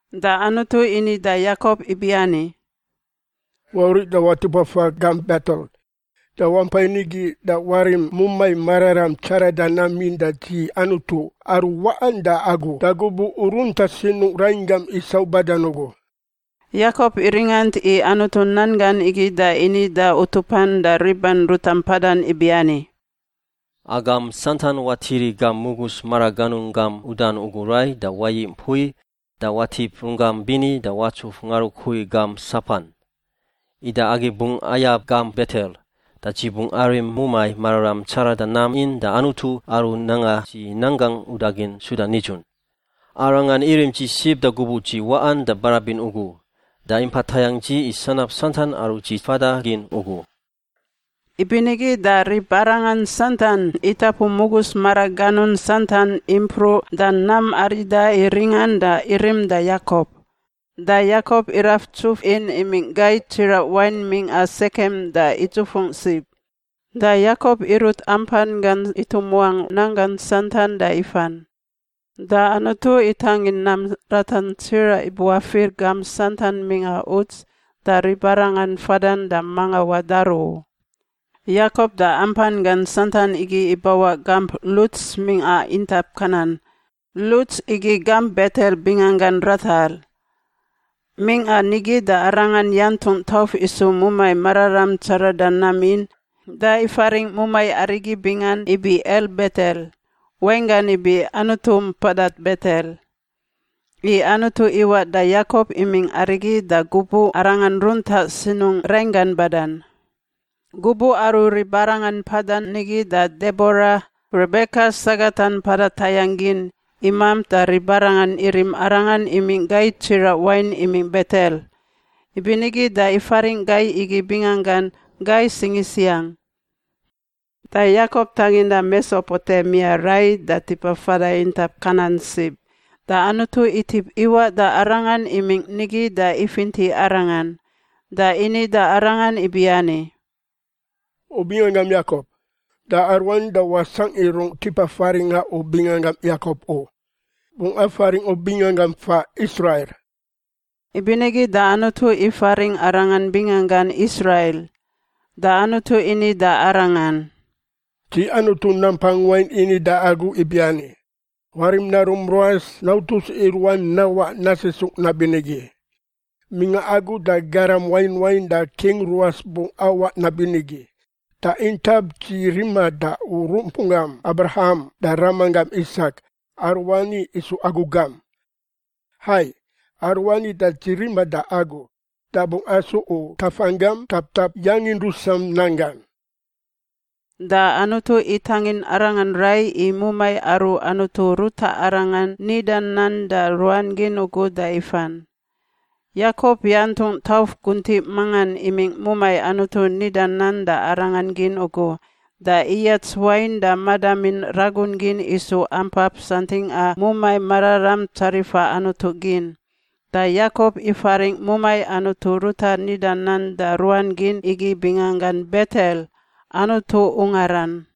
Da Anutu ini da Yakop ibiani, “Wauriꞌ da watip wafa gamp Betel da wampai nigi da warim mumai mararam tsarada nam in da dzi Anutu aru waꞌan da agu da gubuꞌ u runta sinungꞌ rainggam Isau badan ugu.” Yakop iringant i Anutu nan gan igi da ini da utupan da riban ruta mpadan ibiani, “Agam santan watiri gam mugus maraganun gam udan ugu rai da wayiꞌ mpui da watip runggam bini da watsuf ngarukui gam sapan. Ida agi bungꞌ ayab gamp Betel, da dzi bungꞌ arim mumai mararam tsarada nam in da Anutu aru nanga dzi nan gangꞌ udagin suda nidzun. Arangan irim dzi sib da gubuꞌ dzi waꞌan da barabin ugu, da impa tayangꞌ dzi i sanab santan aru dzi fada gin ugu.” Ibinigi da ribarangan santan itapu mugus maraganun santan impruꞌ da nam arida i ringan da irim da Yakop. Da Yakop iraf ntsuf in imingꞌ gai tsiraꞌ wain mingꞌa Sekem da idzufungꞌ sib. Da Yakop irut ampan gan itumuangꞌ nanggan santan da ifan. Da Anutu itangin nam ratan tsiraꞌ ibuafir gamp santan mingꞌa uts da ribarangan fadan da manga wadaru u. Yakop da ampan gan santan igi ibawaꞌ gamp Luts mingꞌa intap Kanan. Luts igi gamp Betel binganggan ratar. Mingꞌan nigi da arangan yantungꞌ tauf isu mumai mararam tsarada nam in da ifaringꞌ mumai arigi bingan ibi El Betel (wainggan ibi Anutu Mpada Betel), i Anutu iwaꞌ da Yakop imingꞌ arigi da gubuꞌ arangan runta sinungꞌ rainggan badan. Gubuꞌ aru ribarangan mpadan nigi da Debora, Rebeka sagatan mpada tayangꞌ gin, imamp da ribarangan irim arangan imingꞌ gai tsiraꞌ wain imingꞌ Betel. Ibinigi da ifaringꞌ gai igi binganggan “Gai Singisiang.” Da Yakop tanginda Mesopotemia rai da tipa fada intap Kanan sib, da Anutu itip iwaꞌ da arangan imingꞌ nigi da ifinti arangan. Da ini da arangan ibiani, “U binganggam Yakop. Da aruani da wasangꞌ i rungꞌ tipa faringꞌa u binganggam Yakop u; bungꞌ afaringꞌ u binganggam faꞌ Israil.” Ibinigi da Anutu ifaringꞌ arangan binganggan Israil. Da Anutu ini da arangan, “Dzi Anutu Nampang Wain ini da agu ibiani, warim narum ruas nautus i ruan nawaꞌ nasisungꞌ nabinigi. Mingꞌa agu da garam wain wain da king ruas bungꞌ awaꞌ nabinigi. Da intap dzi riman da u rumpunggam Abraham da ramanggan Isak aruani isu agu gam. Hai, aruani da dzi rima da agu, da bungꞌ asu u tafanggam taptap yangin rusan nanggan.” Da Anutu itangin arangan rai i mumai aru Anutu ruta arangan nidan nan da ruan gin ugu da ifan. Yakop yantungꞌ tauf guntiꞌ mangan imingꞌ mumai Anutu nida nan da arangan gin ugu da iyats wain da madamin ragun gin isu ampap santingꞌa mumai mararam tsarifa Anutu gin. Da Yakop ifaringꞌ mumai Anutu ruta nida nan da ruan gin igi binganggan Betel— Anutu ungaran.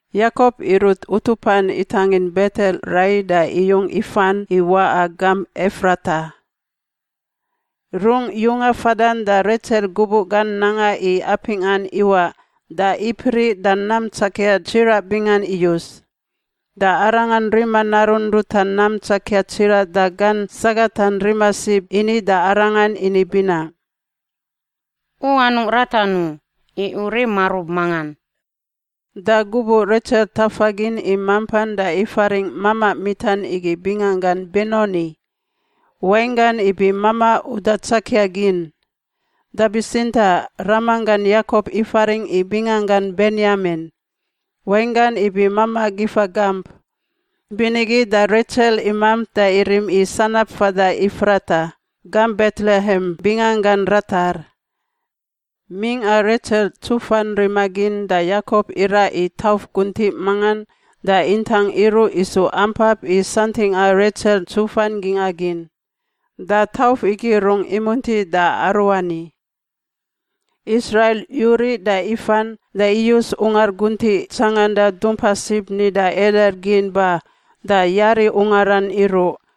Yakop irut utupan itangin Betel rai da iyung ifan i waꞌa gamp Efrata. Rungꞌ yunga fadan da Retsel gubuꞌ gan nanga i apingꞌan iwaꞌ da ipriꞌ da nam tsakia tsiraꞌ bingan iyus. Da arangan rima narun ruta nam tsakia tsiraꞌ da gan sagatan rima sib ini da arangan ini binaꞌ, “U anungꞌ ratan u, i u rim marub mangan.” Da gubuꞌ Retsel ntafa gin i mampan da ifaringꞌ mamaꞌ mitan igi binganggan Benoni (wainggan ibi mamaꞌ uda tsakia gin). Da bitsintaꞌ ramanggan Yakop ifaringꞌ i binganggan Benyamin (wainggan ibi mamaꞌ gifa gamp). Ibinigi da Retsel imamp da irim i sanab fada Efrata (gamp Betlehem binganggan ratar). Mingꞌa Retsel ntsufan rima gin da Yakop iraꞌ i tauf guntiꞌ mangan da intang iruꞌ isu ampap i santingꞌa Retsel ntsufan gingꞌa gin. Da tauf igi rungꞌ imunti da aruani. Israil yuriꞌ da ifan da iyus ungar guntiꞌ tsanganda dumpa sib nida Eder gin ba da yari ungaran iruꞌ.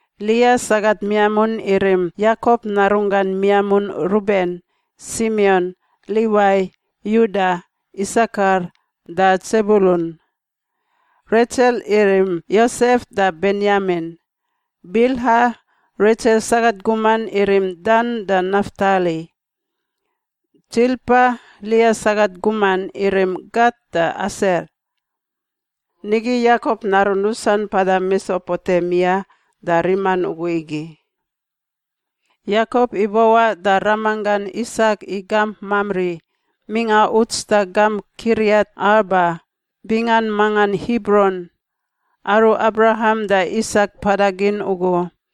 Lia sagat miamun irim: Yakop narunggan miamun Ruben, Simion, Liwai, Yuda, Isakar, da Tsebulun. Retsel irim: Yosef da Benyamin. Bilha, Retsel sagat guman, irim: Dan da Naftali. Tsilpa, Lia sagat guman, irim: Gat da Aser. Nigi Yakop narun rusan mpada Mesopotemia da riman ugu igi. Yakop ibawaꞌ da ramanggan Isak i gamp Mamri, mingꞌa uts da gamp Kiriat Arba (bingan mangan Hibron) aru Abraham da Isak mpada gin ugu.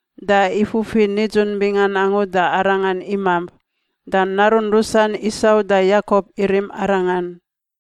da ifufi nidzun bingan angu da arangan imamp. Da narun rusan Isau da Yakop irim arangan.